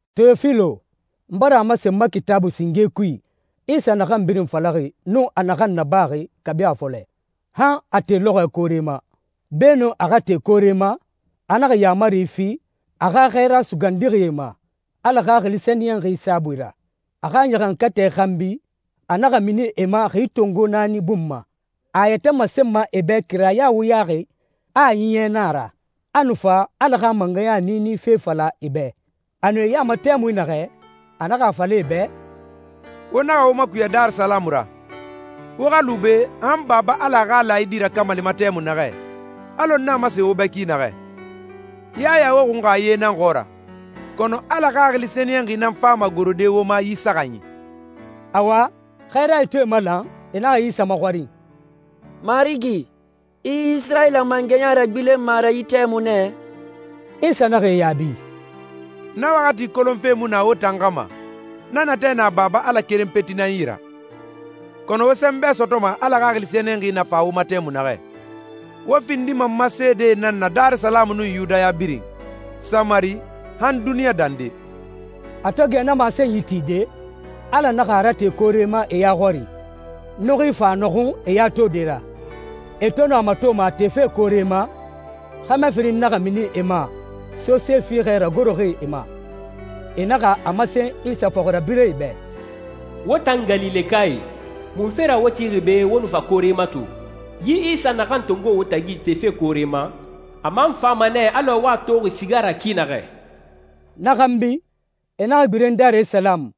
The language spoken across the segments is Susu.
Teyofilo, n bara a masen n ma Kitaabui singe kui Isa naxan birin falaxi nun a naxan nabaxi kabi a fɔlɛ han a te lɔxɔɛ koore ma. Beenun a xa te koore ma, a naxa yaamari fi a xa xɛɛra sugandixie ma, Ala Xaxili Sɛniyɛnxi saabui ra. A xa ɲaxankatɛ xanbi, a naxa mini e ma xi tongo naani bun ma, a a yɛtɛ masenma e bɛ kiraya wuyaxi a a ɲiɲɛ na a ra. A nu fa Ala xa mangɛya niini fe fala e bɛ. A nu e ya ma tɛmui naxɛ, a naxa a fala e bɛ, «Wo naxa wo makuya Darisalamu ra. Wo xa lu be han Baba Ala a xa laayidi rakamalima tɛmui naxɛ, alɔ n na masenxi wo bɛ ki naxɛ. Yaya wo xunxa ye nan xɔɔra, kɔnɔ Ala Xaxili Sɛniyɛnxi nan fama gorode wo ma yi saxanyi.» Awa, xɛɛrae to e malan, e naxa Isa maxɔrin, «Marigi, i Isirayila mangɛya ragbilenma a ra yi tɛmui nɛ?» Isa naxa e yaabi, «Na waxati kolonfe mu na wo tan xa ma. Na natɛ na Baba Ala keren peti nan yi ra. Kɔnɔ, wo sɛnbɛ sɔtɔma Ala Xaxili Sɛniyɛnxi na fa wo ma tɛmui naxɛ. Wo findima n ma seedee nan na Darisalamu nun Yudaya birin, Samari, han duniɲa dande.» A to gɛ na masenyi tide, Ala naxa a rate koore ma e ya xɔri, nuxui fa a nɔxun e ya tode ra. E to nu a matoma a tefe koore ma, xɛmɛ firin naxa mini e ma, sose fiixɛ ragoroxi e ma. E naxa a masen Isa fɔxirabirɛe bɛ, «Wo tan Galilekae, munfe ra wo tixi be wo nu fa koore mato? Yi Isa naxan tongoxi wo tagi tefe koore ma, a man fama nɛ alɔ wo a toxi siga ra ki naxɛ.» Na xanbi e naxa gbilen Darisalamu,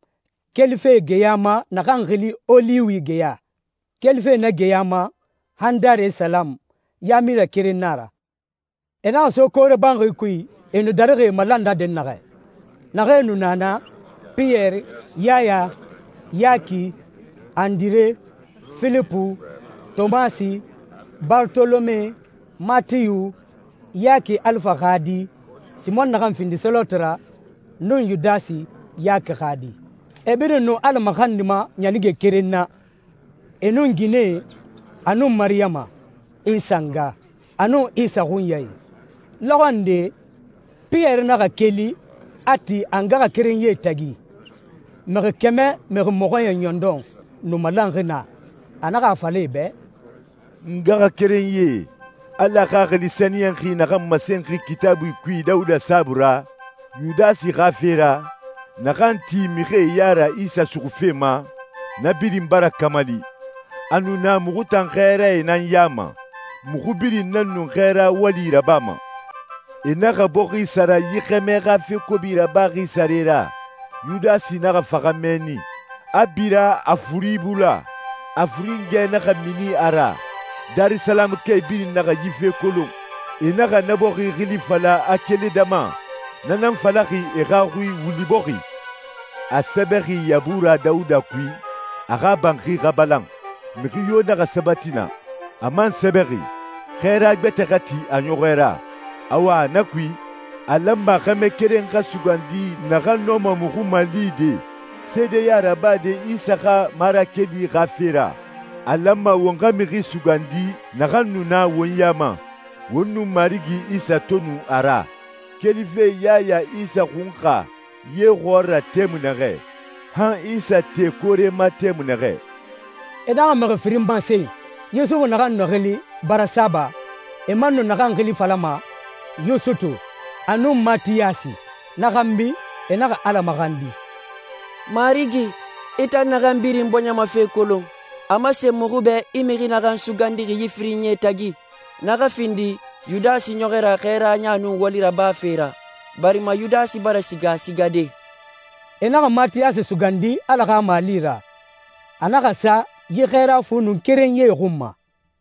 kelife geya ma naxan xili Oliwi geya. Kelife na geya ma han Darisalamu, yaamilɛ keren na a ra. E naxa so koore banxi kui, e nu darixi e malan na dɛnnaxɛ. Naxee nu na na: Piyɛri, Yaya, Yaki, Andire, Filipu, Tomasi, Barotolome, Matiyu, Yaki Alifa xa di, Simɔn naxan findi Seloti ra, nun Yudasi, Yaki xa di. E birin nu Ala maxandima ɲanige keren na, e nun ginɛe, a nun Mariyama, Isa nga, a nun Isa xunyae. Lɔxɔ nde Piyɛri naxa keli, a ti a ngaxakerenyie tagi. Mixi kɛmɛ mixi mɔxɔɲɛn ɲɔndɔn nu malanxi naa. A naxa a fala e bɛ, «N ngaxakerenyie, Ala Xaxili Sɛniyɛnxi naxan masenxi Kitaabui kui Dawuda saabui ra, Yudasi xa fe ra, naxan ti mixie ya ra Isa suxufe ma, na birin bara kamali. A nu na muxu tan xɛɛrae nan ya ma. Muxu birin nan nu xɛɛra wali rabama. E naxa bɔxi sara yi xɛmɛ xa fe kobi rabaxi sare ra. Yudasi naxa faxa mɛnni, a bira, a furi bula, a furingɛe naxa mini a ra. Darisalamukae birin naxa yi fe kolon. E naxa na bɔxi xili fala Akeledama, na nan falaxi e xa xui ‹Wuli Bɔxi›.» «A sɛbɛxi Yabura Dawuda kui, ‹A xa banxi xa balan, mixi yo naxa sabati naa.› A man sɛbɛxi, ‹Xɛɛra gbɛtɛ xa ti a ɲɔxɔɛ ra.› Awa na kui, a lanma xɛmɛ keren xa sugandi naxan nɔma muxu malide seedeya rabade Isa xa marakeli xa fe ra. A lanma won xa mixi sugandi naxan nu na won ya ma, won nun Marigi Isa to nu a ra, kelife Yaya Isa xunxa ye xɔɔra tɛmui naxɛ, han Isa te koore ma tɛmui naxɛ.» E naxa mixi firin masen: Yusufu naxan nu xili Barasaba, e man nu naxan xili falama Yusutu, a nun Matiyasi. Na xanbi e naxa Ala maxandi, «Marigi, i tan naxan birin bɔɲɛ ma fe kolon, a masen muxu bɛ i mixi naxan sugandixi yi firinyie tagi. Na xa findi Yudasi ɲɔxɔɛ ra xɛɛraya nun wali rabafe ra, barima Yudasi bara siga a sigade.» E naxa Matiyasi sugandi Ala xa mali ra. A naxa sa yi xɛɛra fu nun kerenyie xun ma.